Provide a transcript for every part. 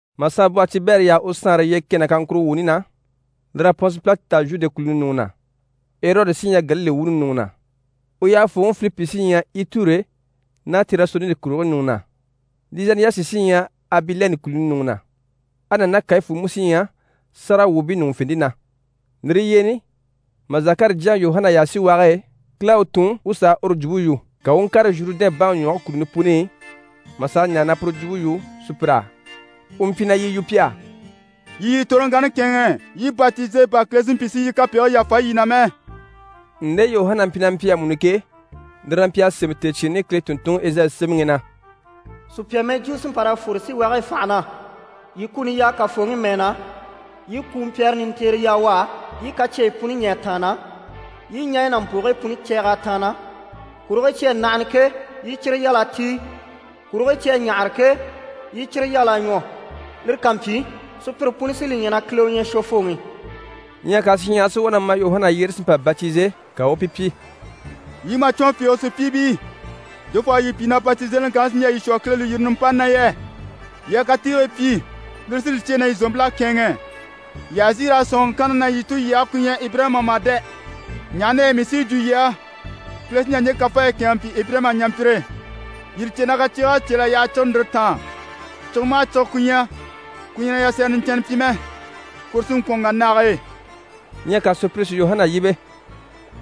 Mà saanbwɔhe Tibɛri yaha u saanre yyee kɛ ná kaŋkuro wuuni na, lir'à Pɔnse Pilati ta Zhude kùluni ɲùŋɔ na, Erɔdi sí ɲyɛ Galile wuuni ɲùŋɔ na, u yyahafooŋi Filipi sí ɲyɛ Iture ná Tirasoniti kùligii ɲùŋɔ na, Lizaniyasi sí ɲyɛ Abilɛni kùluni ɲùŋɔ na, Ana ná Kayifu mú sí ɲyɛ sáragawwuubii ɲùŋufente na, lire yyeeni mà Zakari jyaŋi Yuhana yaha síwage e, Kile à u tun u sà a uru jwumpe yu. Ka u u ŋkàre Zhurudɛn baŋi ɲwɔge kùluni puni i, mà sà a ɲaare na puru jwumpe yu sùpyir'á. U mpyi na yi yu pi á: «Yii yii toroŋkanni kɛ̂ɛnŋɛ, yii batize, bà Kile si mpyi si yii kapegigii yàfa yii na mɛ.» Nde Yuhana mpyi na mpyi amuni ke, lire na mpyi a sémɛ tèecyiini Kile tùnntunŋi Ezayi sémɛŋi i na: «Sùpya mɛjwuu sí n‑pa raa fwore síwage e fànha na “Yii kuni yaa Kafooŋi mɛɛ na, yii kumpyɛrɛ nintiire yaa u á, yii i kacyeyi puni ɲî a tàanna, yii i ɲaɲyi ná mpògigii puni cɛɛg'a tàanna, kurigii cyi à nahana ke, yii i cyire yal'a tíi, kurigii cyi à ɲáhara ke, yii i cyire yal'a ɲwɔ. Lire ká mpyi, sùpyire puni sí li ɲya na Kile u ɲyɛ Shwofooŋi.”» Ɲyɛ ka shinɲyahara si wá na ma Yuhana yyére si mpa batize, ka u u pi pyi: «Yii màcwɔn fiige sùpyiibii, jofoo u à yii pyi na batizeliŋi kanni sí n‑jà yii shwɔ Kile lùyirini nimpani na yɛ? Yii a katiigii pyi, lire sí li cyêe na yii zòompil'à kɛ̂ɛnŋɛ. Yii àha zìi raa sɔ̂nŋi kanna na yii tulyage ku ɲyɛ Ibirayima mà dɛ! Ɲaha na yɛ mii sí yi jwo yii á, Kile sí n‑jà ɲje kafaayi kɛ̂ɛnŋɛ n‑pyi Ibirayima ɲampyire. Yii li cè na kaciig'à cél'a yaha cire ndìre taan. Cige maha cige ku ɲyɛ, ku ɲyɛ na yasɛrɛ niɲcɛnnɛ pyi mɛ, kuru sí n‑kwɔ̀n n‑wà nage e.» Ɲyɛ ka sùpyire si Yuhana yíbe: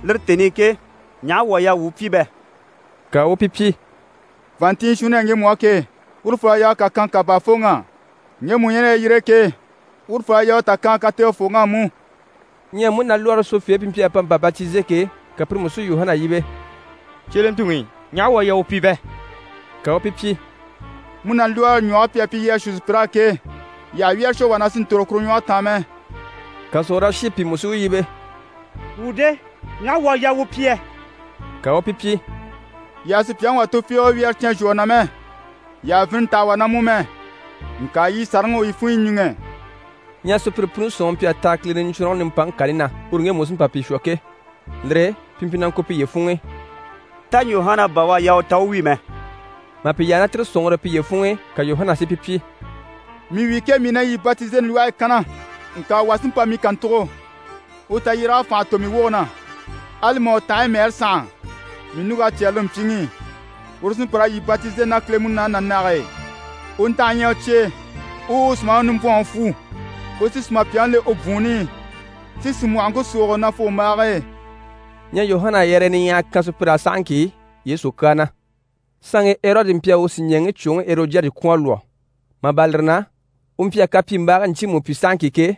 «Lire tèni i ke, ɲaha wuu à yaa wuu pyi bɛ?» Ka u u pi pyi: «Vàanntinnyɛ shuunni ɲyɛ ŋgemu á ke, urufol'à yaa u kà kan kà baafooŋ'á. Ŋgemu u ɲyɛ ná yalyire e ke, urufol'à yaa u tà kan kategefooŋ'á mú.» Ɲyɛ múnalwɔɔre shwofeebii pi mpyi a pa mpa batize ke, ka pire mú si Yuhana yíbe: «Cyelentuŋi, ɲaha wuu à yaa wuu pyi bɛ?» Ka u u pi pyi: «Múnalwɔɔre ɲwɔge pi à pyi yii a shuu sùpyir'á ke, yii àha wyɛ́rɛ shwɔ wà na si ntòro kuru ɲwɔge taan mɛ.» Ka sòrolashiibii pìi mú si u yíbe: «Wuu de? Ɲaha wuu à yaa wuu pyi yɛ?» Ka u u pi pyi: «Yii àha sùpyaŋi wà tufiige wyɛ́rɛ cyán zhwɔ u na mɛ, yii àha vini ntaha wà na mú mɛ. Ŋka yii sàraŋi u yii funɲyi ɲíŋɛ.» Ɲyɛ sùpyire puni sɔ̀nŋɔre mpyi a taha Kile Niɲcwɔnrɔŋi nimpaŋi kani na, uru ŋgemu u sí n‑pa pi shwɔ ke. Lire e pi mpyi na ŋko piye funŋ'i: «Tá Yuhana bà u à yaa u ta u wi mɛ?» Mà pi yaha ná tire sɔ̀nŋɔre e piye funŋ'i, ka Yuhana si pi pyi: «Mii wi ke, mii na yii batizeli lwɔhe e kanna. Ŋka wà sí n‑pa mii kàntugo, uru tayyéreg'à fànha tò mii woge na. Ali mà u tanhaɲyi mɛɛre sànha, mii ɲùŋk'à cyɛ́rɛ lire mpyiŋi i. Uru u sí n‑pa raa yii batizeli ná Kile Munaani ná nage e. U ntanhe ɲyɛ u cye e, u u u sùmaŋi nimbwɔnŋi fwu. U sí sùmapyaŋi le u bwùunni i, si sìmwɔhɔŋke súugo nafugombaage e.» Ɲyɛ Yuhana à yɛrɛyɛ niɲyahaya kan sùpyir'á sahaŋki Yesu kyaa na. Saanŋi Erɔdi mpyi a u sìɲɛɛŋi cwoŋi Erɔdiyadi kwɔ̀n a lwɔ́. Mà bâra lire na, u mpyi a kapyimbaagii ɲcyiimu pyi sahaŋki ke,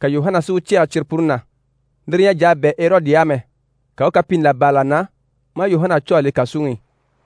ka Yuhana si u cɛ̂ɛgɛ cyire puni na. Lire ɲyɛ a jà a bɛ̂ Erɔdi á mɛ, ka u u kapiini là bâra là na, maa Yuhana cû a le kàsuŋi i.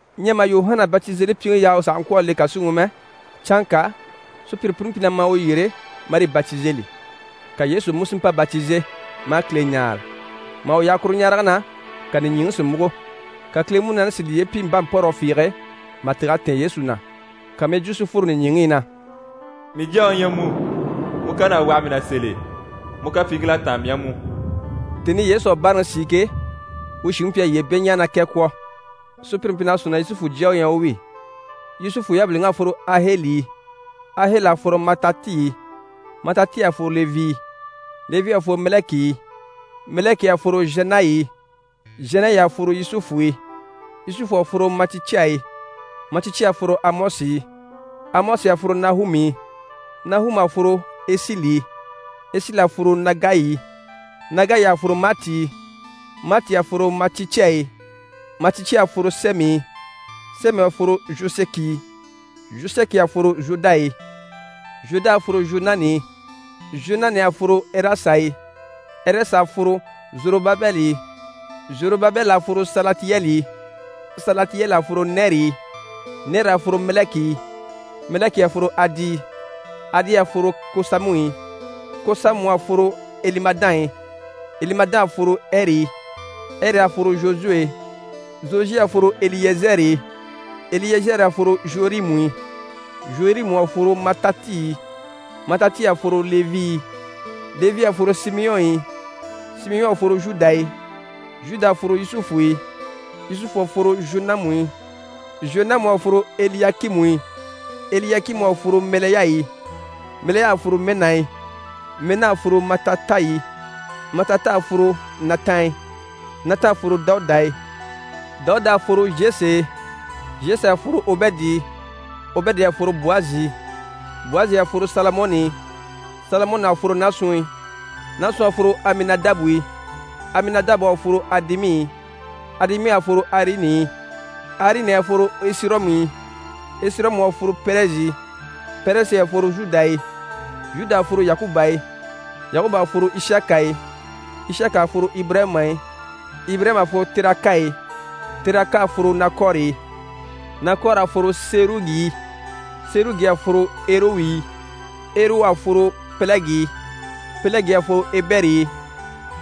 Ɲyɛ mà Yuhana Batizelipyiŋi yaha u sàha ŋkwɔ̀ a le kàsuŋi i mɛ, canŋka sùpyire puni mpyi na ma u yyére marii batizeli, ka Yesu mú si mpa batize, maa Kile ɲáare. Mà u yaha kuru ɲarege na, ka nìɲyiŋi si múgo. Ka Kile Munaani si liye pyi mpánmpɔrɔgɔ fiige mà tîg'a tɛ̀ɛn Yesu na, ka mɛjwuu si fworo nìɲyiŋi i na: «Mii Jyaŋi u ɲyɛ mu, mu kan'à waha mii na sèl'e. Mu kapyiiŋkil'à táan mii á mú.» Tèni i Yesu à báaraŋi sìi ke, u shìŋi mpyi a yyee beɲjaaga ná kɛ kwɔ̀. Sùpyire mpyi na sɔ̂nŋi na Yusufu jya u ɲyɛ u wi. Yusufu yabiliŋ'à fworo Aheli i. Aheli à fworo Matati i. Matati à fworo Levi i. Levi à fworo Mɛlɛki i. Mɛlɛki à fworo Zhanayi i. Zhanayi à fworo Yusufu i. Yusufu à fworo Maticya i. Maticya à fworo Amɔsi i. Amɔsi à fworo Nahumu i. Nahumu à fworo Ɛsili i. Ɛsili à fworo Nagayi i. Nagayi à fworo Maati i. Maati à fworo Maticya i. Maticya à fworo Sɛmɛ i. Sɛmɛ à fworo Zhosɛki i. Zhosɛki à fworo Zhoda i. Zhoda à fworo Zhwɔnani i. Zhwɔnani à fworo Ɛrɛsa i. Ɛrɛsa à fworo Zorobabɛli i. Zorobabɛli à fworo Salatiyɛli i. Salatiyɛli à fworo Nɛri i. Nɛri à fworo Mɛlɛki i. Mɛlɛki à fworo Adi i. Adi à fworo Kosamu i. Kosamu à fworo Elimadan i. Elimadan à fworo Ɛri i. Ɛri à fworo Zhosuwe e. Zhosuwe à fworo Eliyɛzɛri i. Eliyɛzɛri à fworo Zhorimu i. Zhorimu à fworo Matati i. Matati à fworo Levi i. Levi à fworo Simiyɔn i. Simiyɔn à fworo Zhuda i. Zhuda à fworo Yusufu i. Yusufu à fworo Zhonamu i. Zhonamu à fworo Eliyakimu i. Eliyakimu à fworo Mɛlɛya i. Mɛlɛya à fworo Mɛna i. Mɛna à fworo Matata i. Matata à fworo Natan i. Natan à fworo Dawuda i. Dawuda à fworo Zhese e. Zhese à fworo Obɛdi i. Obɛdi à fworo Bwazi i. Bwazi à fworo Salamɔni i. Salamɔni à fworo Naasun i. Naasun à fworo Aminadabu i. Aminadabu à fworo Adimi i. Adimi à fworo Arini i. Arini à fworo Esirɔmu i. Esirɔmu à fworo Pɛrɛzi i. Pɛrɛzi à fworo Zhuda i. Zhuda à fworo Yakuba i. Yakuba à fworo Ishaka i. Ishaka à fworo Ibirayima i. Ibirayima à fworo Teraka i. Teraka à fworo Nakwɔri i. Nakwɔri à fworo Serugi i. Serugi à fworo Erewu i. Erewu à fworo Pɛlɛgi i. Pɛlɛgi à fworo Ebɛri i.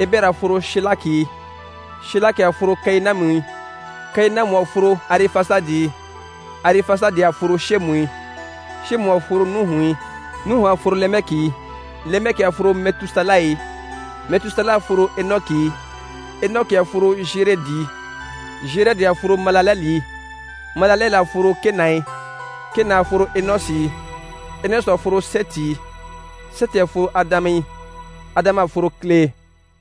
Ebɛri à fworo Shelaki i. Shelaki à fworo Kayinamu i. Kayinamu à fworo Arifasadi i. Arifasadi à fworo Shɛmu i. Shɛmu à fworo Nuhu i. Nuhu à fworo Lemɛki i. Lemɛki à fworo Mɛtusala i. Mɛtusala à fworo Enɔki i. Enɔki à fworo Zherɛdi i. Zherɛdi à fworo Malalɛli i. Malalɛli à fworo Kena i. Kena à fworo Enɔsi i. Enɔsi à fworo Sɛti i. Sɛti à fworo Adama i. Adama à fworo Kile e.